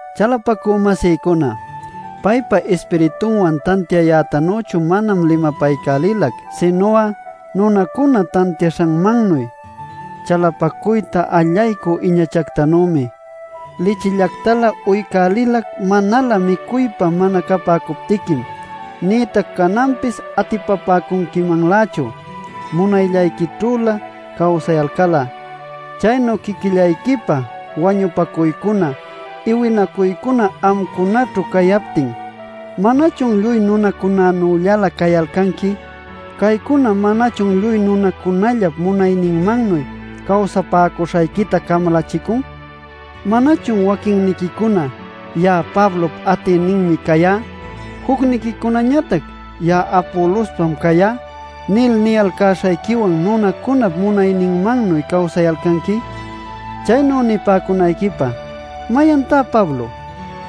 Chalapacü-masïcuna, paypa Ispiritunwan tantiayätanüchu manam limapaycälilac, sinu'a nunacuna tantiaśhanmannuy, chalapacuyta allaycü iñachacunactanümi. Lichillactalä uycälilac manalä micuypa mana capäcuptiquim; nïtac cananpis atipapäcunquimanlächu, munayllayquićhülä cawsayalcal'a. Chaynu quiquillayquipä wañupacuycuna, iwinacuycuna amcunaćhu cayaptin ¿manachun lluy nunacunanüllalä cayalcanqui? Caycuna ¿manachun lluy nunacunallap munayninmannuy cawsapäcuśhayquita camalachicun? ¿Manachun waquinniquicuna: “Ya'a Pablop atïninmi cayá” jucniquicunañatac: “Ya'a Apolospam cayá” nil niyalcäśhayquiwan nunacunap munayninmannuy cawsayalcanqui? Chaynu nipäcunayquipä ¿mayantá Pablo?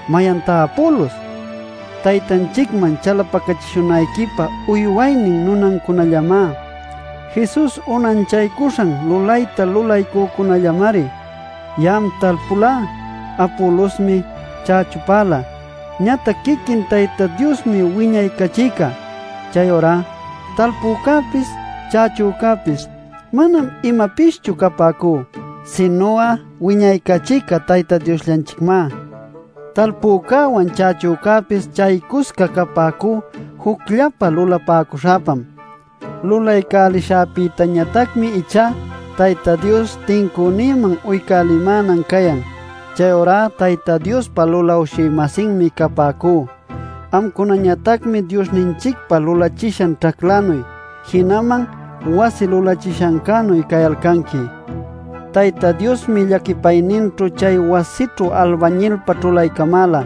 ¿Mayantá Apolos? Taytanchicman chalapacachishunayquipä uywaynin nunancunallamá; Jesus unanchaycuśhan lulayta lulaycücunällamari. Ya'am talpulá; Apolosmi chächupäla. Ñatac quiquin Tayta Diosmi wiñaycachïcá. Chayurá talpücäpis, chächupacäpis manam imapischu capäcú, sinu'a wiñaycachïcá Tayta Diosllanchicmá. Talpücäwan chächücäpis chaycusca capäcú jucllapä lulapäcuśhäpam. Lulaycälishäpïtañatacmi ichá Tayta Dios tincünïman uycälimänan cayan. Chayurá Tayta Diospa lulawshï-masinmi capäcú; amcunañatacmi Diosllanchicpa lulachishan ćhaclannuy, jinaman wasi lulachishancänuy cayalcanqui. Tayta Diosmi llaquipayninćhu chay wasićhu albañilpa ćhulaycamäla.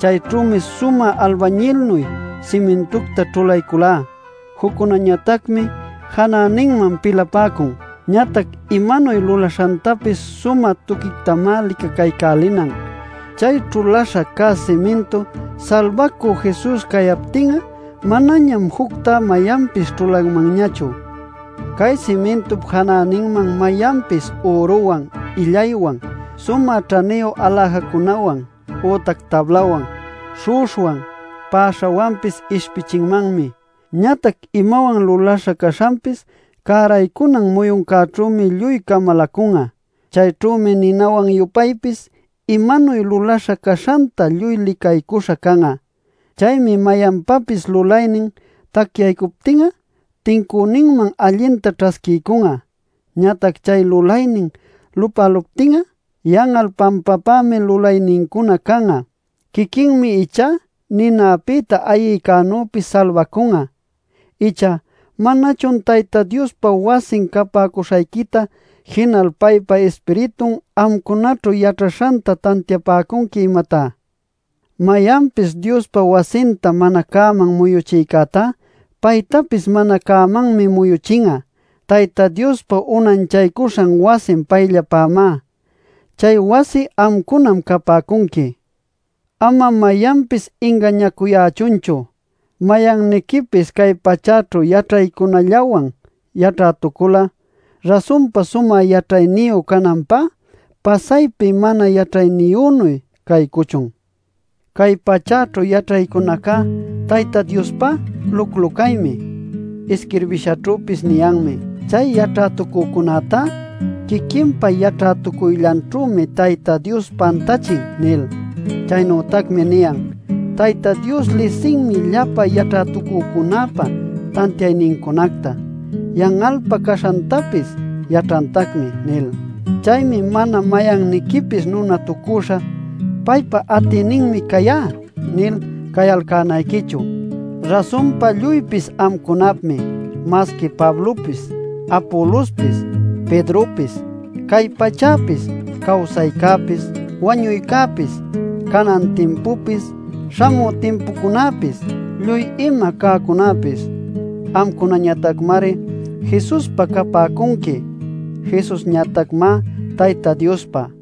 Chayćhümi sumä albañilnuy simintunta ćhulayculá. Juccunañatacmi janäninman pilapäcun. Ñatac imanuy lulaśhantapis sumä tuquictamá licacaycälinan. Chay ćhuläśha cä simintu Salbacü Jesus cayaptin'a manañam juctá mayanpis ćhulanmanñachu. Cay simintup janäninman mayanpis üruwan, illaywan, sumä ćhaniyu aläjacunawan, ütac tablawan, śhu'uśhwan, päśhawanpis ishpichinmanmi. Ñatac imawan lulaśha caśhanpis cäraycunan muyuncäćhümi lluy camalacun'a. Chayćhümi ninawan-yupaypis imanuy lulaśha caśhanta lluy licaycuśha can'a. Chaymi mayanpapis lulaynin, tacyaycuptin'a tincüninman allinta ćhasquiycun'a. Ñatac chay lulaynin lupäluptin'a yan'al pampapämi lulaynincuna can'a. Quiquinmi ichá ninapïta ayïcänüpis salbacun'a. Icha ¿manachun Tayta Diospa wasin capäcuśhayquita, jinal paypa Ispiritun amcunaćhu yaćhaśhanta tantiapäcunqui, imatá? Mayanpis Diospa wasinta mana cäman muyuchïcätá, paytapis mana cämantacmi muyuchin'a. Tayta Diospa unanchaycuśha wasin payllapämá; chay wasi amcunam capäcunqui. Ama mayanpis ingañacuyächunchu: mayanniquipis cay pachäćhu yaćhaycunallawan yaćhätucul'a, rasunpa sumä yaćhayniyu cananpá pasaypi mana yaćhayniyünuy caycuchun. Cay pachäćhu yaćhaycunaca Tayta Diospá luclu-caymi. Isquirbishanćhüpis niyanmi: “Chay yaćhätucücunätá quiquinpa yaćhätucuyllanćhümi Tayta Dios pantächin” nil. Chaynütacmi niyan: “Tayta Dios lisinmi llapa yaćhätucücunäpa tantiaynincunacta; yan'alpä caśhantapis yaćhantacmi” nil. Chaymi mana mayanniquipis nunatucüśha “Paypa atïninmi cayá” nil cayalcänayquichu. Rasunpa, lluypis amcunapmi: masqui Pablopis, Apolospis, Pedropis, cay pachäpis, cawsaycäpis, wañuycäpis, canan timpupis, śhamü timpucunäpis, lluy ima cäcunäpis. Amcunañatacmari Jesuspa capäcunqui, Jesusñatacmá Tayta Diospa.